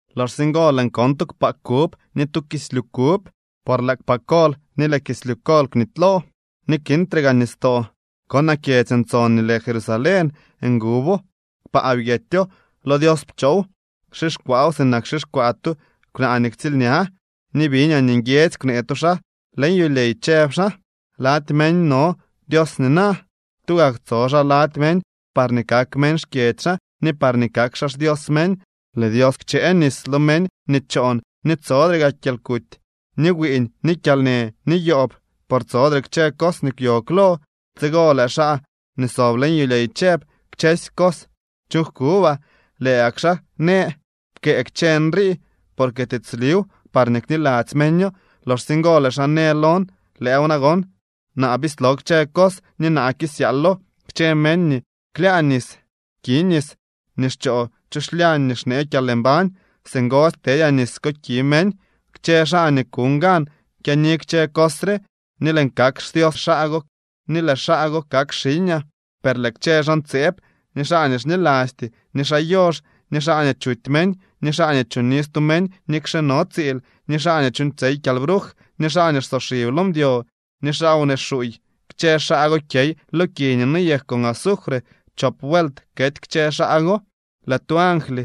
Loxsye ngo lëën kon tu kpaa kub ni tu kislyu kub, por lëë kpaa kol ni lëë kislyu kol kwnitylo, ni kintre gaa nistoo. Konaa kyedzy ntson nii lë Jerusalén. Ngubo, kpaa byetyo, lo Dios pchoow. Xixkwaaw sinak xixkwaa tu kwnaa nii ktsiilña. Ni biñaa nii nguiedzy kwnee tu xaa leñ yulyey, chëb xaa: —Lady meñ no Dios nina. Tugak tso xaa lady meñ parñee kak meñ xkyedzy xaa ni parñee kak xaa xDios meñ. Lëë Dios kchëë nis lo meñ nii choon ni tsodre gaa kyalkuty, ni wiiñ ni kyalnë, ni yoob, por tsodre kchë cos nii kwyo klo. Tsigo lëë xaa nii sob leñ yulyey chëb: —Kchësy cos chuuñ jkubaa. Lëë gak xaa në: —Pkëë kchë nrii porque tiitsliw parñee kniladzy meño. Loxsye ngo lëë xaa në lon: —Lëëw nagon. Naa bislo kchë cos ni naa kisyaalo. Kchë meñ nii klyaa nis ki nis nii xchoo chu xlyañ nii xnee kyalmbañ. Singosy ktedyaa nis ko ki meñ. Kchë xaa nii kuñ gan kyaani kchë cos re, ni lëën kak xDios xaa go ni lëë xaa go kak xiñaa. Per lëë kchë xaa ntseeb, ni xaa nii xnilasty, ni xaa yox, ni xaa nii chuty meñ, ni xaa nii choni stu meñ nikxe no tsiil, ni xaa nii chuuñtsyey kyalbruj, ni xaa nii xsoxib lo mdyo, ni xaa wnee xuuy, kchë xaa go kyey lo ki nii noyek con azufre. Chop vuelt kety kchë xaa go. Lëë tu angly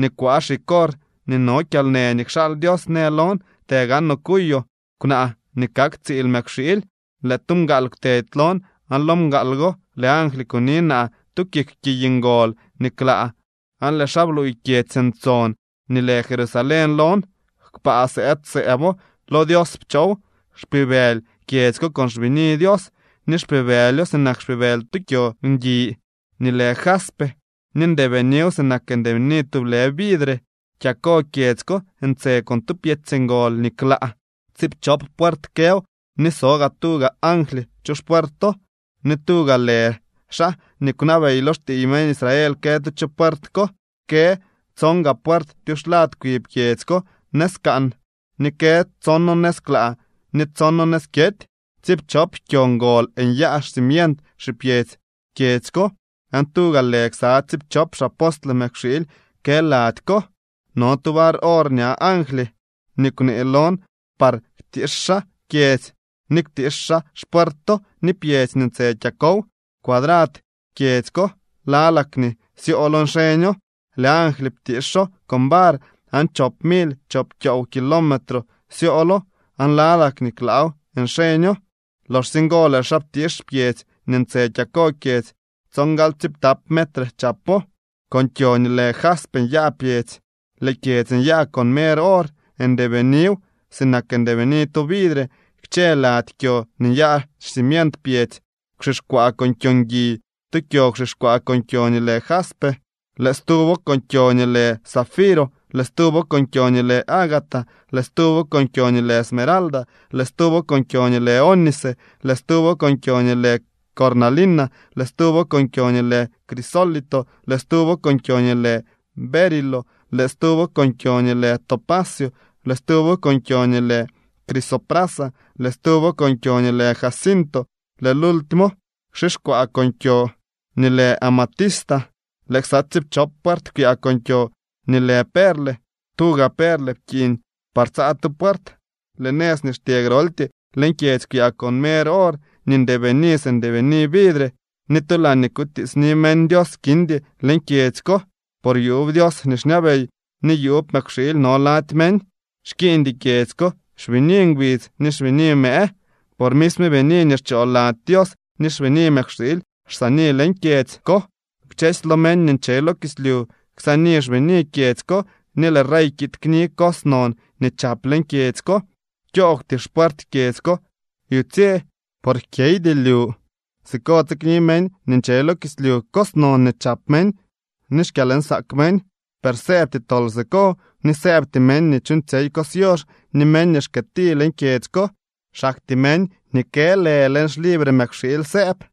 nii kwaa xig or nii no kyalnë nii kxaal Dios në lon: —Të gaanoo kuyoo kwnaa nii kak tsiil Mëkwxiily. Lëë tu mgaal kwtedy lon aan lo mgaal go lëë angly kuni naa tu kik kiy ngol nii klaa aan lëë xaa bluuy kyedzy ntson nii lë Jerusalén lon. Kpaa sëëd sëëbo, lo Dios pchoow. Xpibëly kyedzy ko con xbini Dios, ni xpibëlyo sinak xpibëly tu kyo ngui nii lë jaspe ni ndeebiniw sinak ndeebini tublë vidre. Kyako kyedzy ko ntse con tu pkyedzy ngol nii klaa. Tsiipchop puert këw, ni so gaa tuga angly chu xpuerto, ni tuga lë xaa nii kwnabey lo xtiiy meñ Israel kë tu chu puert ko. Kë tson gaa puert tyuxlad kwi pyedzy ko nëz kaan, ni kë tsono nëz klaa ni tsono nëz kyety. Tsiipchop kyo ngol nyaa xcimient xipyedzy kyedzy ko, aan tuga lë ksa tsiipchop xapostle Mëkwxiily kë laady ko. No tu var or ña angly nii kwnee lon par ktiix xaa kyedzy, ni ktiix xaa xpuerto ni pyedzy nii ntse kyakow. Cuadrad kyedzy ko lalak nii syoolo nxeño. Lëë angly ptiixo con var aan chop mily chop kyoow kilometro syoolo aan lalak nii klaaw nxeño. Loxsye ngo lëë xaa ptiix pyedzy nii ntse kyako kyedzy, tsongalyptap metre chapo. Con kyo nii lë jaspe nyaa pyedzy, lëë kyedzy nyaa con mer or, ndeebiniw sinak ndeebini tu vidre. Kchë lady kyo nii nyaa xcimient pyedzy kwxixkwaa con kyo ngui, tu kyo kwxixkwaa con kyo nii lë jaspe, lëë stuwo con kyo nii lë zafiro, lëë stuwo con kyo nii lë ágata, lëë stuwo con kyo nii lë esmeralda, lëë stuwo con kyo nii lë ónice, lëë stuwo con kyo nii lë cornalina, lëë stuwo con kyo nii lë crisólito, lëë stuwo con kyo nii lë berilo, lëë stuwo con kyo nii lë topacio, lëë stuwo con kyo nii lë crisoprasa, lëë stuwo con kyo nii lë jacinto, lëë lultimo kwxixkwaa con kyo nii lë amatista. Lëë ksa tsiipchop puert kwyaa con kyo nii lë perle, tuga perle pkiiñ par tsaa tu puert. Lëë nëz nii xtyee groltyee leñ kyedzy kwyaa con mer or nii ndeebini si ndeebini vidre. Ni tu laañee kutiitsni meñ Dios kindy leñ kyedzy ko, por yuub Dios nii xñabey ni yuub Mëkwxiily no lady meñ. Xkiiñdy kyedzy ko xbini ngbidz ni xbini mëë, por misme bini nii xchoo lady Dios ni xbini Mëkwxiily xsaani leñ kyedzy ko. Kchësy lo meñ nii nche lo kislyu ksaani xbini kyedzy ko, ni lëë rey kiid kni cos non nii chap leñ kyedzy ko. Kyoogwty xpuert kyedzy ko yutsye, por jkyeydy lyu. Siko tsikni meñ nii nche lo kislyu cos non nii chap meñ ni xkyalnsaak meñ. Per sëëbty tol siko, ni sëëbty meñ nii chuuñtsyey cos yox ni meñ nii xkëëti leñ kyedzy ko. Xaktyee meñ nii kë lë leñ xlibre Mëkwxiily sëëb.